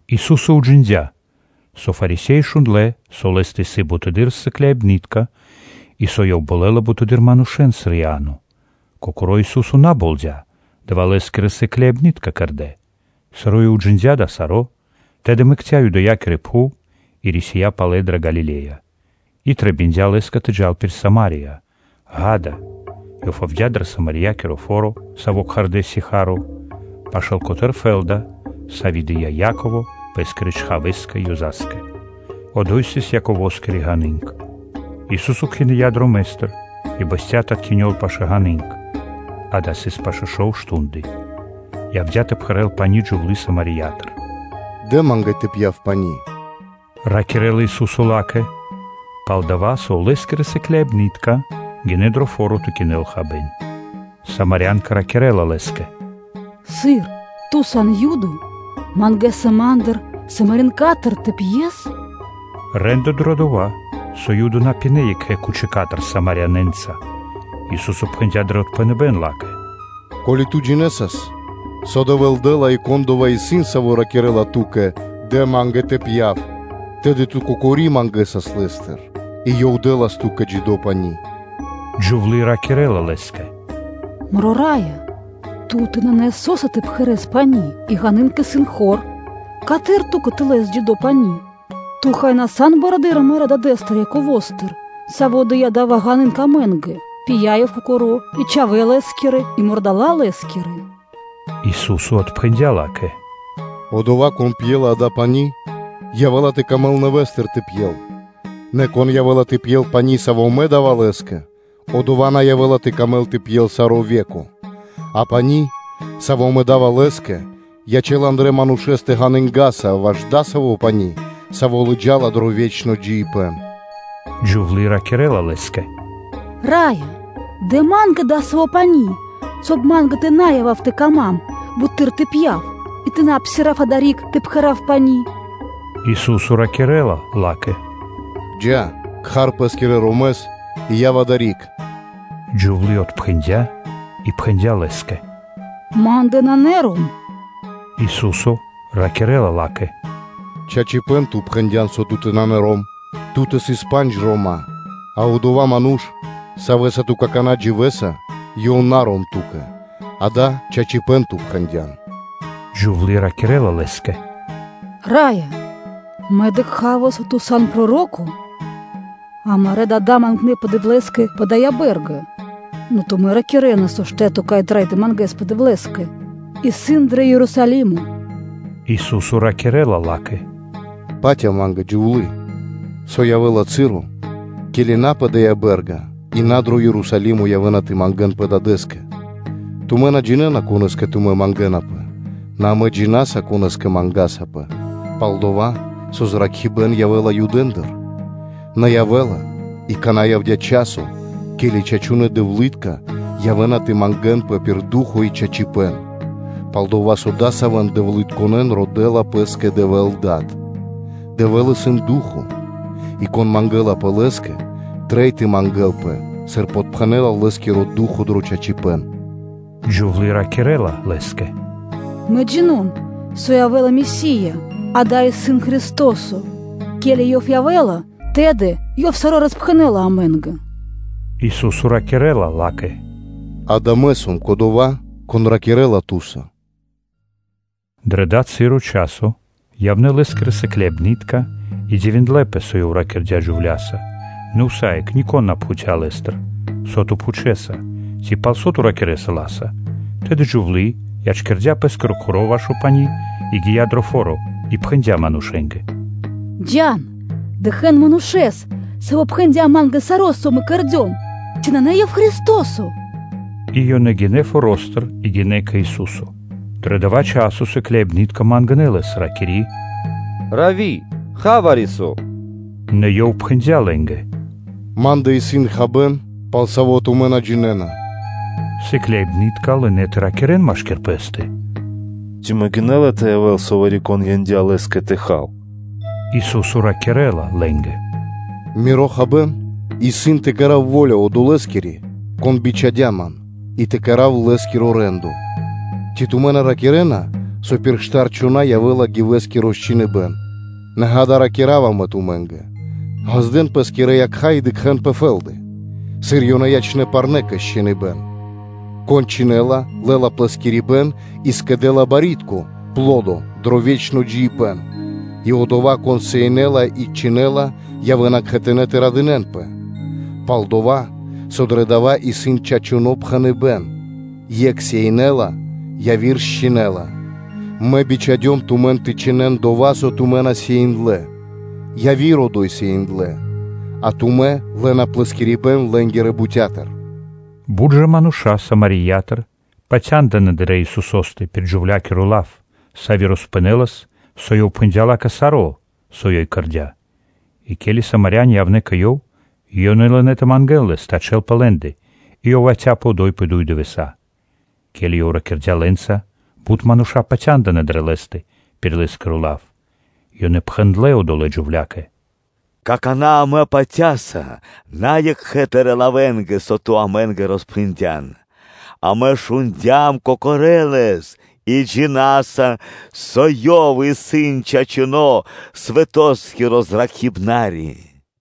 Ису́со уджиндя́, со Фарисе́и шундлэ́, со Лэ́стэ исын буты́р сыкляибны́тка, и со Ёв болэла бутэды́р манушэ́н, сыр Иа́но. Кокоро́ Ису́со на болдя, Лэ́скирэ сыкляибны́тка кэрдэ́ дава́. Сыр Ёв уджиндя́ дава́ саро́, тэды мэкця́ Юдэякири пхув и рисия́ палэ дрэ Галиле́я. И трэбиндя Лэ́скэ тэ джал пир Сама́рия. Ѓа́да, Ёв явдя́ дрэ Самариякиро фо́ро, саво́ кхардэ́ Сихарь, пашы́л фэ́лда, сави́ дыя́ Яково пэ́скирэ чхавэ́скэ Ёза́скэ. Одо́й сыс Яковоскири ґаны́нг (колодцо). Ису́со кхиныя дромэ́стыр и бэсця́ тэ откинёл пашы́л ґаны́нг; ґа́да, сыс пашэ́ шов мардэ́ (штунды). Явдя́ тэ пхэрэл пани́ джувлы́ Самариятыр. ‘Дэ Ма́нгэ тэ пья́в пани́”, – ракирэ́ла Ису́со ла́кэ. Палдава́ со Лэ́скирэ сыкляибны́тка гинэ́ дро фо́ро тэ кинэн хабэ́н. Самарянка ракирэ́ла Лэ́скэ: “Сыр? Ту сан Юдо, мангэса ма́ндыр, Самарянкатыр тэ пьес? Рэ́ндо (де́ло) дрэ дова́, со Юды на пинэ́ екхэ кучикатыр Самарянэнца. Ису́со пхэндя́ дро отпхэныбэ́н ла́кэ: “Ко́ли ту джинэсас, со Дэвэ́л дэ́ла и Кон одова́ исын, Саво́ ракирэ́ла ту́кэ: “Дэ Ма́нгэ тэ пья́в,’ тэды ту кокори мангэсас Лэ́стыр, и Ёв дэ́лас ту́кэ джидо́ пани́.” Джувлы́ ракирэ́ла Лэ́скэ: “Мро Раё! Ту́тэ нанэ со́са тэ пхэрэс пани́ и ґаны́нг исын хор: Каты́р Ту́кэ тэ лэс джидо́ пани́?” Ту, хай, на сан барэды́р амарэ́ дадэ́стыр Яковостыр, саво́ дыя́ дая ґаны́нг амэ́нгэ, пия ёв кокоро́, и чхавэ́ лэ́скирэ, и кхэри́тка мурдала́ лэ́скирэ (ското)?” Ису́со отпхэндя́ ла́кэ: “Одова́, кон пьела дава́ пани́, явэ́ла тэ камэл нэвэ́стыр тэ пьел. Нэ кон явэ́ла тэ пьел пани́, саво́ Мэ да́ва лэ́скэ, одова́ на явэ́ла тэ камэл тэ пьел саро́ ве́ко; а пани́, саво́ Мэ да́ва лэ́скэ, ячэ́ла андра́л манушэ́стэ ґанынгаса ваш дасаво пани́, саво́ лыджа́ла дро ве́чно джиибэ́н.” Джувлы́ ракирэ́ла Лэ́скэ: “Раё! Дэ ма́нгэ дасаво пани́, соб (кай) ма́нгэ тэ на явав тэ кама́м буты́р тэ пья́в и тэ на псирав адари́к тэ пхэрав пани́.” Ису́со ракирэ́ла ла́кэ: “Джа́, кхар пэ́скирэ ромэс и яв адари́к.” Джувлы́ отпхэндя́ и пхэндя́ Лэ́скэ: “Ма́ндэ нанэ ром.” Ису́со ракирэ́ла ла́кэ: “Чачипэ́н ту пхэндя́н, со ту́тэ нанэ ром; ту́тэ сыс пандж рома́, а одова́ ману́ш, савэ́са ту какана́ дживэса, ёв исын на ром ту́кэ; дава́ чачипэ́н ту пхэндя́н.” Джувлы́ ракирэ́ла Лэ́скэ “Раё! Мэ дыкха́ва, со Ту сан проро́ко. Амарэ́ дада́ мангнэпэ Дэвлэ́скэ пэ дая́ бэ́рга, нэ тумэ́ ракирэ́на, со штэ́то, кай трэй тэ мангэспэ Дэвлэ́скэ, исын дро Ерусалимо.” Ису́со ракирэ́ла ла́кэ: “Патя Ма́нгэ, джувлы́, со явэ́ла часо (цы́ро), ке́ли на пэ дая́ бэ́рга и на дро Ерусалимо явэ́на тэ мангэ́нпэ Дадэ́скэ. Тумэ́ на джинэ́на, конэ́скэ тумэ́ мангэ́напэ: нэ амэ джина́са, конэ́скэ мангасапэ, пал-дова́ со зракхибэ́н явэ́ла Юдэндыр. Нэ явэ́ла, и акана́ явдя́ часо, ке́ли чачунэ́ дэвлы́тка явэ́на тэ дэн паты́в пир ду́хо (фа́но) и чачипэ́н, пал-дова́ со адасавэн дэвлытконэн родэ́ла Пэ́скэ Дэвэ́л Дад. Дэвэ́л исын ду́хо (фа́но), и кон мангэлапэ Лэ́скэ, трэй тэ мангэ́лпэ, сыр подпхэнэла Лэ́скиро Ду́хо (Фа́но) дро чачипэ́н.” Джувлы́ ракирэ́ла Лэ́скэ: “Мэ джино́м (джина́в), со явэ́ла Месия, ґа́да, исын Христо́со; ке́ли Ёв явэ́ла, тэды Ёв саро́ роспхэнэ́ла амэ́нгэ.” Ису́со ракирэ́ла ла́кэ: “Ѓа́да, Мэ сом Кодова́, Кон ракирэ́ла ту́са.” Дро дава́ часо (цы́ро) явнэ́ Лэ́скирэ сыкляибны́тка и дивиндлэ́пэ, со Ёв ракирдя́ джувля́са; нэ усае́кх нико́н на пхуця́ Лэ́стыр: “Со Ту пхучэса?” Ци: “Пал со Ту ракирэ́са ла́са?” Тэды джувлы́ ячкирдя́ пэ́скиро кхоро́ ваш пани́, и гия́ дро фо́ро, и пхэндя́ манушэ́нгэ: “Джа́н, дыкхэ́н Манушэ́с, Саво́ пхэндя́ ма́нгэ саро́, со мэ кэрдём, ци на Ёв исын Христо́со?” И ёнэ гинэ́ форо́стыр и гинэ́ кэ Ису́со. Дро дова́ часо сыкляибны́тка мангнэ́ Лэс, ракири́: “Равви, ха вари-со!” Нэ Ёв пхэндя́ лэ́нгэ: “Ма́ндэ исын хабэ́н, пал саво́ тумэ́ на джинэ́на.” Сыкляибны́тка лынэ́ тэ ракирэ́н машки́р пэ́стэ: “Ци могинэ́ла тэ явэ́л, со вари-кон яндя́ Лэ́скэ тэ хал?” Ису́со ракирэ́ла лэ́нгэ: “Миро хабэ́н исын тэ кэра́в во́ля Одолэскири, Кон бичхадя́ Ман, и тэ кэра́в Лэ́скиро рэ́ндо. Ци на тумэ́ ракирэ́на, со пир штар чхона́ явэ́ла гивэскиро чхиныбэ́н? Нэ, ґа́да, Мэ ракира́ва тумэ́нгэ: ґаздэ́н пэ́скирэ якха́ и дыкхэ́н пэ фэ́лды, сыр Ёнэ ячнэ́ парнэ́ кэ счхиныбэн. Кон чхинэла, лэ́ла плэскирибэн и скэдэ́ла барьякирдо́ (пло́до) дро ве́чно джиибэ́н и одова́, кон сеинэла и чхинэла, явэ́на кхэтанэ́ тэ радынэ́нпэ. Пал-дова́ со дро дава́ исын чачуно́ пхэныбэ́н: ‘Екх сеинэла, яви́р счхинэла’. Мэ бичхадём тумэн тэ чхинэн дова́, со тумэ́ на сеиндлэ: яви́р одо́й сеиндлэ, а тумэ́ лэ́на плэскирибэн лэ́нгирэ бутя́тыр.” Бут ж мануша́ Самариятыр патяндынэ́ дрэ Исусо́стэ пир джувля́киро лав, сави́ роспхэнэлас, со Ёв пхэндя́ ла́кэ саро́, со ёй кэрдя́. И ке́ли Самаряни явнэ́ кэ Ёв, ёнэ лынэ́ тэ мангэ́н Лэс тэ ячэ́лпэ лэ́ндэ, и Ёв яця́пэ одо́й пэ дуй дывэса́. Ке́ли Ёв ракирдя́ лэ́нца, бут мануша́ патяндынэ́ дрэ Лэ́стэ пир Лэ́скиро лав. Ёнэ пхэндлэ́ одолэ́ джувля́кэ: “Какана́ амэ патя́са на екхэ тырэ́ лавэнгэ, со ту амэ́нгэ роспхэндян. Амэ шундя́м кокорэ́ Лэс и джина́са, со Ёв исын чачуно́ свэтоскиро Зракхибнари.”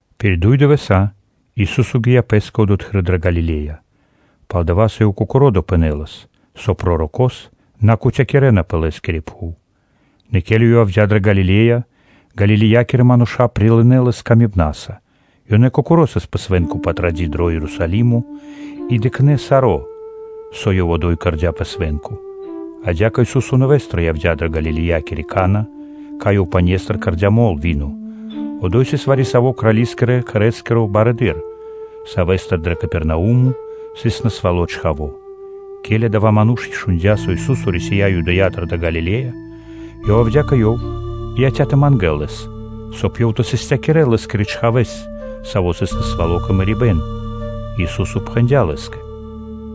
Пир дуй дывэса́ Ису́со гия́ Пэ́скэ одотхы́р дрэ Галиле́я, палдава́, со Ёв кокоро́ допхэнэлас, со пророко́с на кутякирэна пэ лэ́скири пхув. Нэ ке́ли Ёв явдя́ дрэ Галиле́я, Галилеякирэ мануша́ прилынэ́ Лэс илэ́са. Ёнэ кокорэ́ сыс пэ Свэ́нко Патради́ дро Ерусалимо и дыкхнэ́ саро́, со Ёв одо́й кэрдя́ пэ свэ́нко. Адя́кэ Ису́со нэвэ́стыр явдя́ дрэ Галилеякири Кана́, кай Ёв пане́стыр кэрдя́ мол (вино). Одо́й сыс вари-саво́ крали́скиро ману́ш, савэ́стэ дрэ Капернаумо сыс насвало́ чхаво́. Ке́ли адава́ ману́ш шундя́, со Ису́со рисия́ Юдэя́тыр дрэ Галиле́я, то ёв явдя́ кэ Ёв и яця́ тэ мангэ́л Лэс, соб (кай) Ёв тэ састякирэл Лэ́скирэ чхавэ́с, саво́ сыс насвало́ кэ мэрибэ́н. Ису́со пхэндя́ лэ́скэ: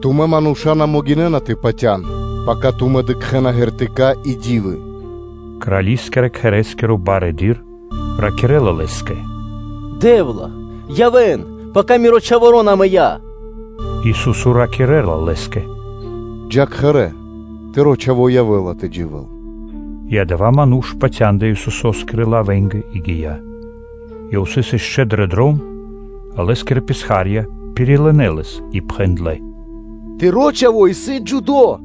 “Тумэ́ мануша́ на могинэ́на тэ патя́н, пака тумэ́ дыкхэ́на знаме́нии (ґертыка́) и ди́вы.” Крали́скирэ-кхэрэ́скиро барыдыро́ ракирэ́ла Лэ́скэ: “Раё Дэ́вла! Яв, пака миро чхаворо́ на мыя́. Ису́со ракирэ́ла лэ́скэ: “Джа́ кхэрэ́, тыро́ чхаво́ явэ́ла тэ дживэ́л”, и адава́ ману́ш патяндыя Исусо́скирэ лавэнгэ и гия́. Ёв сыс ишчо (инкэ́) дро дром, Лэ́скирэ писха́рья пирилынэ лэс и пхэндлэ́: “Тыро́ чхаво́ исын джидо́.”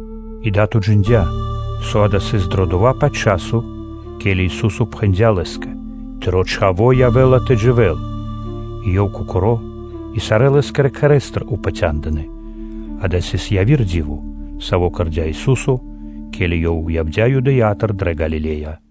И дад уджиндя́, со дава́ сыс дрэ дова́-паць часо, ке́ли Ису́со пхэндя́ лэ́скэ: “Тыро́ чхаво́ явэ́ла тэ дживэ́л”, и ёв кокоро́, и сарэ́ Лэ́скирэ кхэрэ́стыр упатя́ндынэ. Дава́ сыс яви́р ди́во, саво́ кэрдя́ Ису́со, ке́ли Ёв явдя́ Юдэя́тыр дрэ Галиле́я.